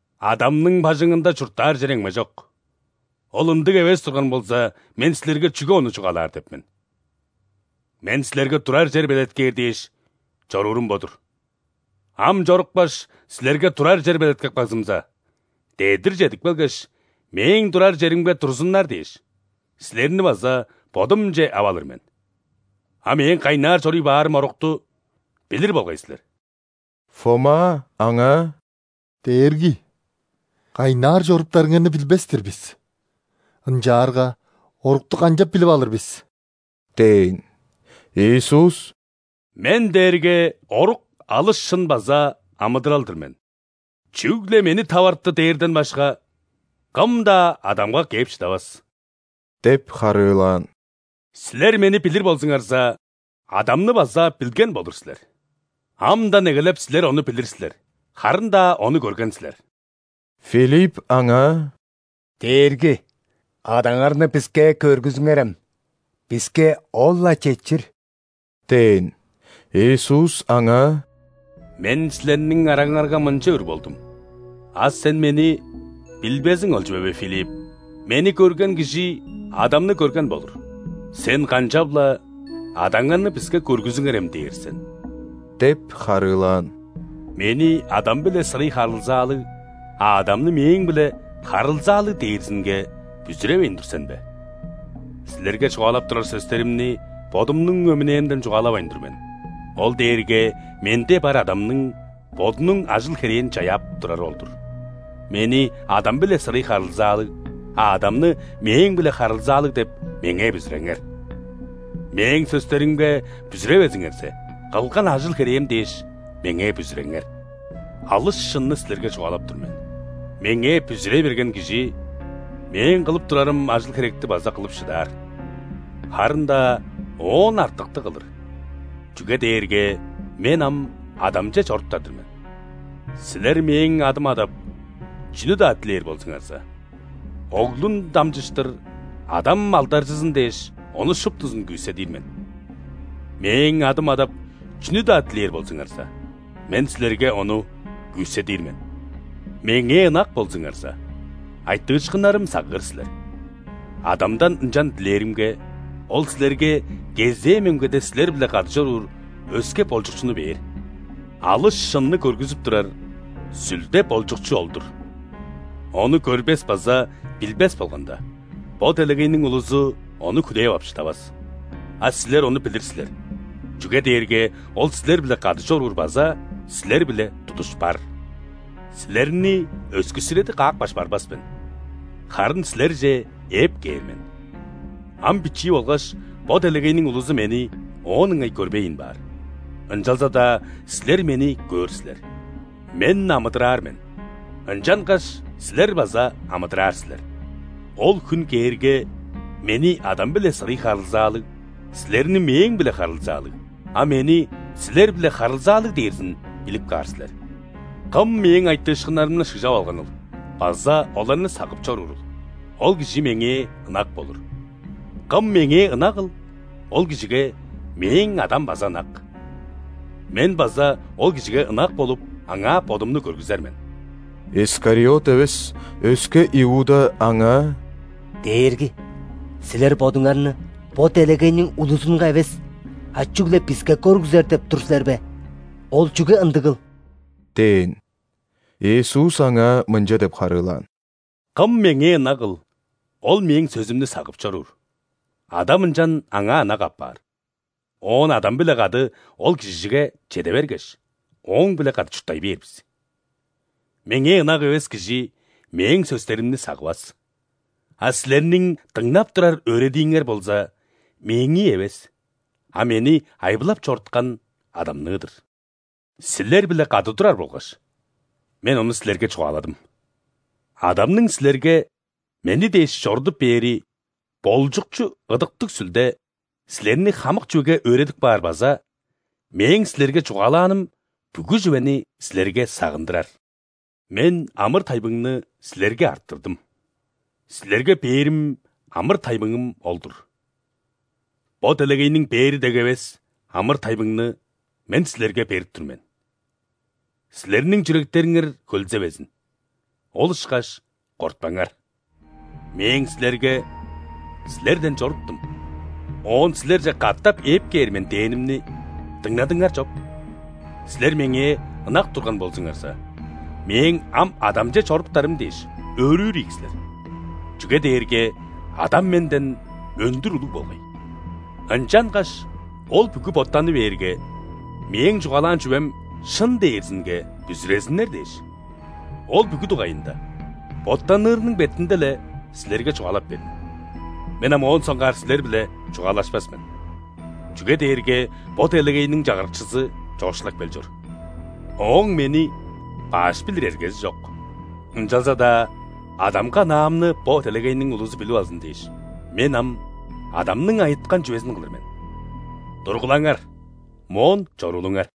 Адамның бажыңында чурттаар чер эмгежок. Ол ындыг эвес турган болза, Мен силерге чүге ону чугаалаар деп мен. Мен силерге турар чер белеткээр дээш, чоруурум бо-дур. Ам чорупкаш, силерге турар чер белеткеп кагзымза, дедир чедип келгеш, Мээң турар черимге турзуннар дээш, силерни база Бодумче ап алыр мен. А Мээң кайнаар чоруй баарым орукту билир болгай силер». Фома Аңаа: «Дээрги! Кайнаар чоруптарыңарны билбес-тир бис. Ынчаарга орукту канчап билип алыр бис?» – дээн. Иисус: «Мен дээрге орук, алыс шын база амыдырал-дыр мен. Чүгле Мени таварты дээрден башка, кым-даа Адамга кээп шыдавас – деп харыылаан. – Силер Мени билир болзуңарза, Адамны база билген болур силер. Амдан эгелеп, силер Ону билир силер, харын-даа Ону көрген силер». Филипп Аңаа: «Дээрги! Адаңарны биске көргүзүңерем, биске ол-ла четчир» – дээн. Иисус аңаа: «Мен силерниң араңарга мынча үр болдум, а сен Мени билбезиң ол чүве бе, Филипп? Мени көрген кижи Адамны көрген болур. Сен канчап-ла: „Адаңарны биске көргүзүңерем“ – дээр сен?» – деп харыылаан. «Мени – Адам-биле сырый харылзаалыг, а Адамны – Мээң-биле харылзаалыг дээрзинге бүзүревейн тур сен бе? Силерге чугаалап турар сөстеримни Бодумнуң өмүнээмден чугаалавайн тур мен: ол дээрге Менде бар Адамның Бодунуң ажыл-херээн чаяап турары ол-дур. Мени – Адам-биле сырый харылзаалыг, а Адамны – Мээң-биле харылзаалыг деп, Меңээ бүзүреңер. Мээң сөстеримге бүзүревезиңерзе, кылган ажыл-херээм дээш, Меңээ бүзүреңер. Алыс шынны силерге чугаалап тур мен: Меңээ бүзүрей берген кижи Мээң кылып турарым ажыл-херекти база кылып шыдаар, харын-даа оон артыкты кылыр, чүге дээрге Мен ам Адамче чоруптар-дыр мен. Силер Мээң адым адап, чүнү-даа дилээр болзуңарза, Оглун дамчыштыр Адам алдаржызын дээш, ону шуптузун күүседир мен. Мээң адым адап, чүнү-даа дилээр болзуңарза, Мен силерге ону күүседир мен». «Меңээ ынак болзуңарза, айтыышкыннарым сагыыр силер. Адамдан ынчан дилээримге, Ол силерге кезээ мөңгеде силер-биле кады чоруур өске Болчукчуну бээр. Алыс шынны көргүзүп турар Сүлде – Болчукчу ол-дур. Ону көрбес база билбес болганда, бо делегейниң улузу Ону хүлээп ап шыдавас. А силер Ону билир силер, чүге дээрге Ол силер-биле кады чоруур база силер-биле тудуш бар. Силерни өскүссүреди каапкаш барбас мен, харын силерже ээп кээр мен. Ам бичии болгаш, бо делегейниң улузу Мени оон ыңай көрбейн баар, ынчалза-даа силер Мени көөр силер. Мен амыдыраар мен, ынчангаш силер база амыдыраар силер. Ол хүн кээрге, Мени – Адам-биле сырый харылзаалыг, силерни – Мээң-биле харылзаалыг, а Мени – силер-биле харылзаалыг дээрзин билип каар силер. Кым Мээң айтыышкыннарымны шыгжап алганыл база оларны сагып чоруурул, ол кижи Меңээ ынак болур. Кым Меңээ ынагыл, ол кижиге Мээң Адам база ынак. Мен база ол кижиге ынак болуп, аңаа Бодумну көргүзер мен». Искариот эвес, өске Иуда Аңаа: «Дээрги! Силер Бодуңарны бо делегейниң улузунга эвес, а чүгле биске көргүзер деп тур силер бе? Ол чүге ындыгыл?» – дээн. Иисус аңаа мынча деп харыылаан: «Кым Меңээ ынагыл, ол Мээң сөзүмнү сагып чоруур. Адам ынчан аңаа ынак апаар, оон Адам-биле кады ол кижиге чеде бергеш, ооң-биле кады чурттай бээр бис. Меңээ ынак эвес кижи Мээң сөстеримни сагывас. А силерниң дыңнап турар өөредииңер болза Мээңии эвес, а Мени айбылап чоруткан Адамныы-дыр. Силер-биле кады турар болгаш, Мен ону силерге чугааладым. Адамның силерге Мени дээш чорудуп бээри Болчукчу – Ыдыктыг Сүлде силерни хамык чүвеге өөредип каар база Мээң силерге чугаалааным бүгү чүвени силерге сагындырар. Мен амыр-тайбыңны силерге арттырдым, силерге бээрим амыр-тайбыңым ол-дур. Бо делегейниң бээри дег эвес амыр-тайбыңны Мен силерге берип тур мен. Силерниң чүректериңер хөлзевезин, ол ышкаш кортпаңар. Мээң силерге: „Силерден чоруптум, оон силерже катап ээп кээр мен“ – дээнимни дыңнадыңар чоп. Силер Меңээ ынак турган болзуңарза, Мээң ам Адамче чоруптарым дээш, өөрүүр ийик силер. Чүге дээрге Адам Менден өндүр улуг болгай. Ынчангаш ол бүгү боттаны бээрге, Мээң чугаалаан чүвем шын дээрзинге бүзүрезиннер дээш, ол бүгү дугайында, боттанырының бетинде-ле, силерге чугаалап бердим. Мен ам моон соңгаар силер-биле чугаалашпас мен, чүге дээрге бо делегейниң чагырыкчызы чоокшулап кел чор. Ооң Мени баш билир эргези чок, ынчалза-даа Адамга ынаамны бо делегейниң улузу билип алзын дээш, Мен ам Адамның айыткан чүвезин кылыр мен. Тургулаңар, моон чоруулуңар!»